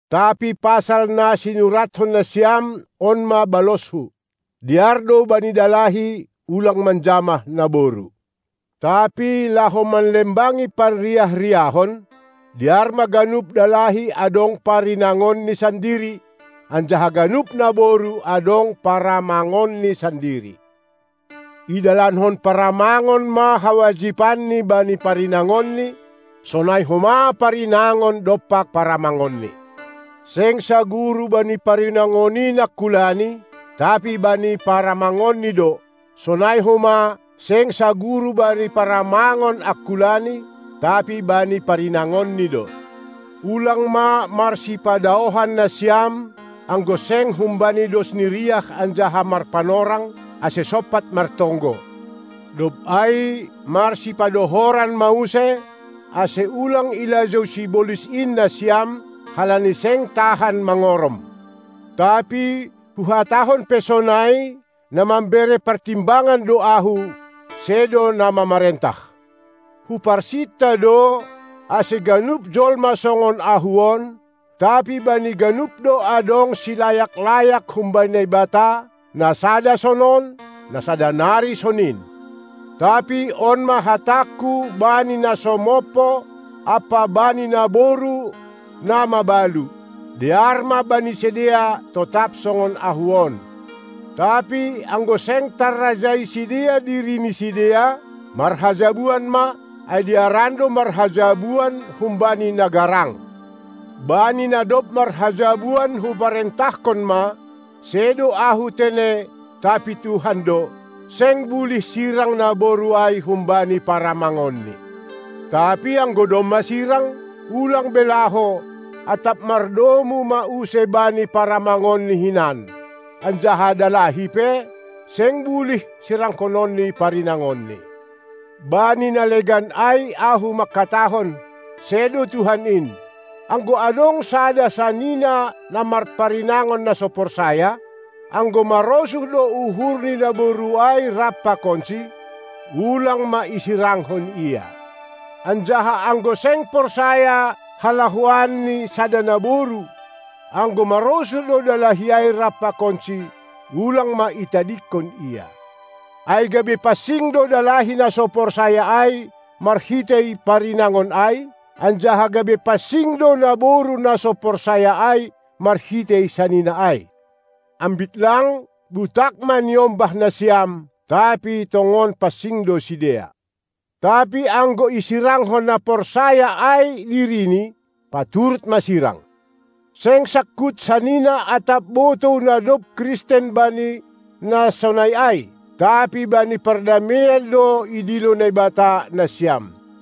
Tapi pasal na sinuratkon nasiam, on ma balosku: Dear do bani dalahi, ulang manjamah naboru. Tapi laho manlembangi parriah-riahon, dear ma ganup dalahi adong parinangonni sandiri, anjaha ganup naboru adong paramangonni sandiri. Idalankon paramangon ma hawajipanni bani parinangonni, sonai homa parinangon dompak paramangonni. Seng saguru bani parinangon in angkulani, tapi bani paramangonni do; sonai homa, seng saguru bani paramangon angkulani, tapi bani parinangonni do. Ulang ma marsipadaohan nasiam, anggo seng humbani dos ni riah anjaha marpanorang, ase sompat martonggo; dob ai marsipadohoran ma use, ase ulang ilajou sibolis in nasiam, halani seng tahan mangorom. Tapi huhatahon pe sonai, na mambere partimbangan do ahu, sedo na mamarentah. Huparsinta do ase ganup jolma songon ahu on; tapi bani ganup do adong silayak-layak humbani Naibata, na sada sonon, na sada nari sonin. Tapi on ma hatangku bani na so mompo ampa bani naboru na mabalu: Dear ma bani sidea, totap songon ahu on. Tapi anggo seng tarrajai sidea diri ni sidea, marhajabuan ma; ai dearan do marhajabuan humbani na garang. Bani na dob marhajabuan huparentahkon ma, sedo ahu tene tapi Tuhan do: Seng bulih sirang naboru ai humbani paramangonni. Tapi anggo domma sirang, ulang be laho, atap mardomu ma use bani paramangonni hinan. Anjaha dalahi pe, seng bulih sirangkononni parinangonni. Bani na legan ai ahu mangkatahon, sedo Tuhan in: Anggo adong sada sanina na marparinangon na so porsaya, anggo marosuh do uhur ni naboru ai rap pakonsi, ulang ma isirangkon ia. Anjaha anggo seng porsaya halahoan ni sada naboru, anggo marosuh do dalahi ai rap pakonsi, ulang ma itadingkon ia. Ase gabe pansing do dalahi na so porsaya ai marhitei parinangon ai, anjaha gabe pansing do naboru na so porsaya ai marhitei sanina ai. Ambit lang, butak ma niombah nasiam, tapi tongon pansing do sidea. Tapi anggo isirangkon na so porsaya ai dirini, paturut ma sirang. Seng sangkut sanina atap botou na dob Kristen bani na sonai ai; tapi bani pardameian do idilo Naibata nasiam.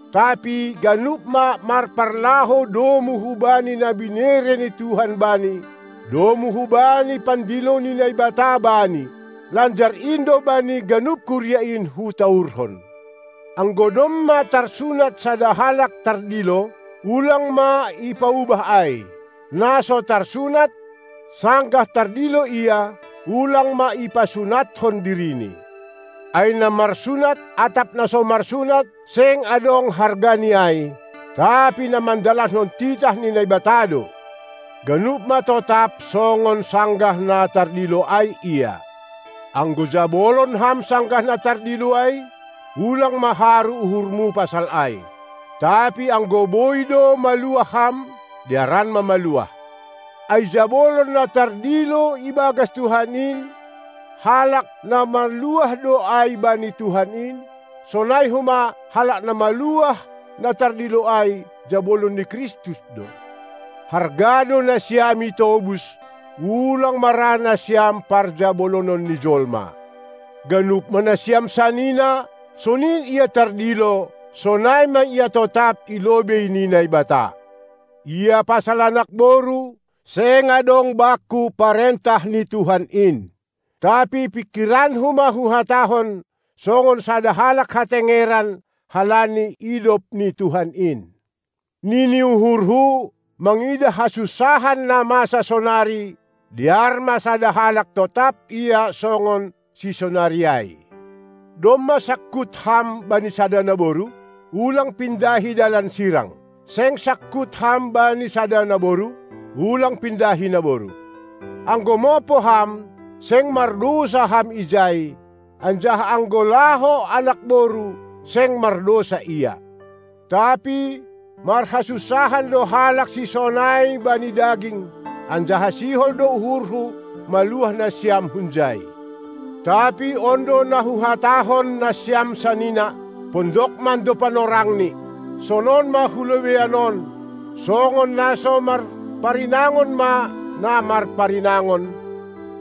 Tapi ganup ma marpalahou domu hubani na binere ni Tuhan bani, domu hubani pandilo ni Naibata bani. Lanjar in do bani ganup kuria in hutaurhon. Anggo domma tarsunat sada halak tardilo, ulang ma ipaubah ai; na so tarsunat, sanggah tardilo ia, ulang ma ipasunatkon dirini. Ai na marsunat atap na so marsunat seng adong harga ni ai, tapi na mandalankon titah ni Naibata do. Ganup ma totap songon sanggah na tardilo ai ia. Anggo jabolon ham sanggah na tardilo ai, ulang ma haru uhurmu pasal ai. Tapi anggo boi do maluah ham, dearan ma maluah. Ai jabolon na tardilo ibagas Tuhan in, halak na maluah do ai bani Tuhan in; sonai homa, halak na maluah na tardilo ai, jabolon ni Kristus do. Harga do nasiam itobus, ulang ma ra nasiam parjabolonon ni jolma. Ganup ma nasiam sanina, sonin ia tardilo, sonai ma ia totap i lobei ni Naibata. Ia pasal anak boru, seng adong bakku parentah ni Tuhan in. Tapi pingkiranku ma huhatahon songon sada halak hatengeran, halani idop ni Tuhan in. Nini uhurhu, mangidah hasunsahan na masa sonari, dear ma sada halak totap ia songon sisonari ai. Domma sangkut ham bani sada naboru? ulang pindahi dalan sirang! Seng sangkut ham bani sada naboru? Ulang pindahi naboru! Anggo mompo ham, seng mardousa ham ijai, anjaha anggo laho anak boru seng mardousa ia. Tapi marhasunsahan do halak sisonai bani daging, anjaha sihol do uhurhu maluah nasiam hunjai. Tapi on do na huhatahon, nasiam sanina: Pondok mando panorangni. Sonon ma hu lobeian on: Songon na so marparinangon ma na marparinangon,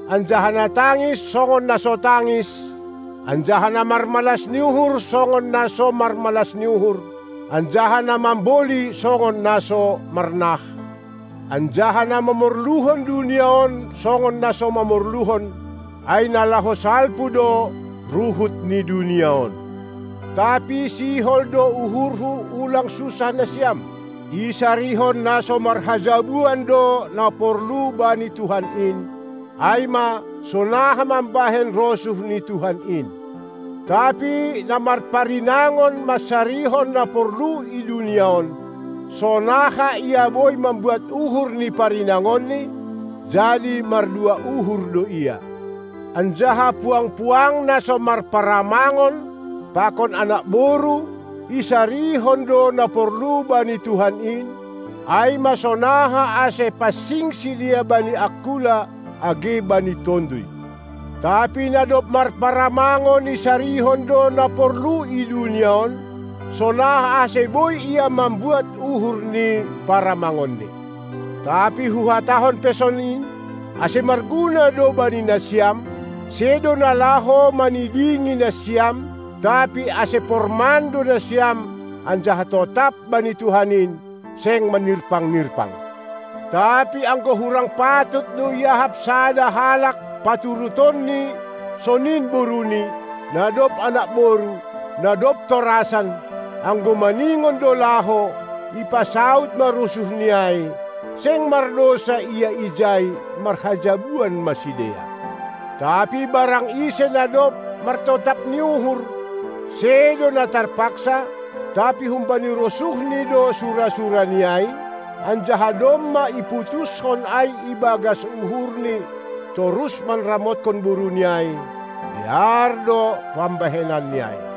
anjaha na tangis songon na so tangis, anjaha na marmalas ni uhur songon na so marmalas ni uhur, anjaha na mamboli songon na so marnah, anjaha na mamorluhon dunia on songon na so mamorluhon, ai na laho salpu do ruhut ni dunia on. Tapi sihol do uhurhu ulang sunsah nasiam. Isarihon na so marhajabuan do na porlu bani Tuhan in, ai ma, sonaha mambahen rosuh ni Tuhan in. Tapi na marparinangon mansarihon na porlu i dunia on, sonaha ia boi mambuat uhur ni parinangonni, jadi mardua uhur do ia. Anjaha puang-puang na so marparamangon pakon anak boru, isarihon do na porlu bani Tuhan in, ai ma sonaha ase pansing sidea bani angkula age bani tonduy. Tapi na dob marparamangon isarihon do na porlu i dunia on, sonaha ase boi ia mambuat uhur ni paramangonni. Tapi huhatahon pe sonin, ase marguna do bani nasiam, sedo na laho manidingi nasiam, tapi ase porman do nasiam anjaha totap bani Tuhan in, seng manirpang-nirpang. Tapi anggo hurang patut do iahap sada halak paturutonni sonin boruni, na dob anak boru, na dob torasan, anggo maningon do laho, ipasaud ma rosuhni ai; seng mardousa ia ijai, marhajabuan ma sidea. Tapi barang ise na dob martotap ni uhur, sedo na tarpaksa, tapi humbani rosuhni do sura-surani ai, anjaha domma iputuskon ai ibagas uhurni torus manramotkon boruni ai, dear do pambahenni ai.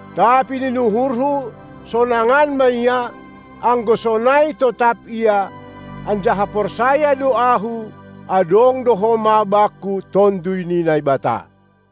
Tapi nini uhurhu, sonangan ma ia, anggo sonai totap ia, anjaha porsaya do ahu adong do homa bakku Tonduy ni Naibata.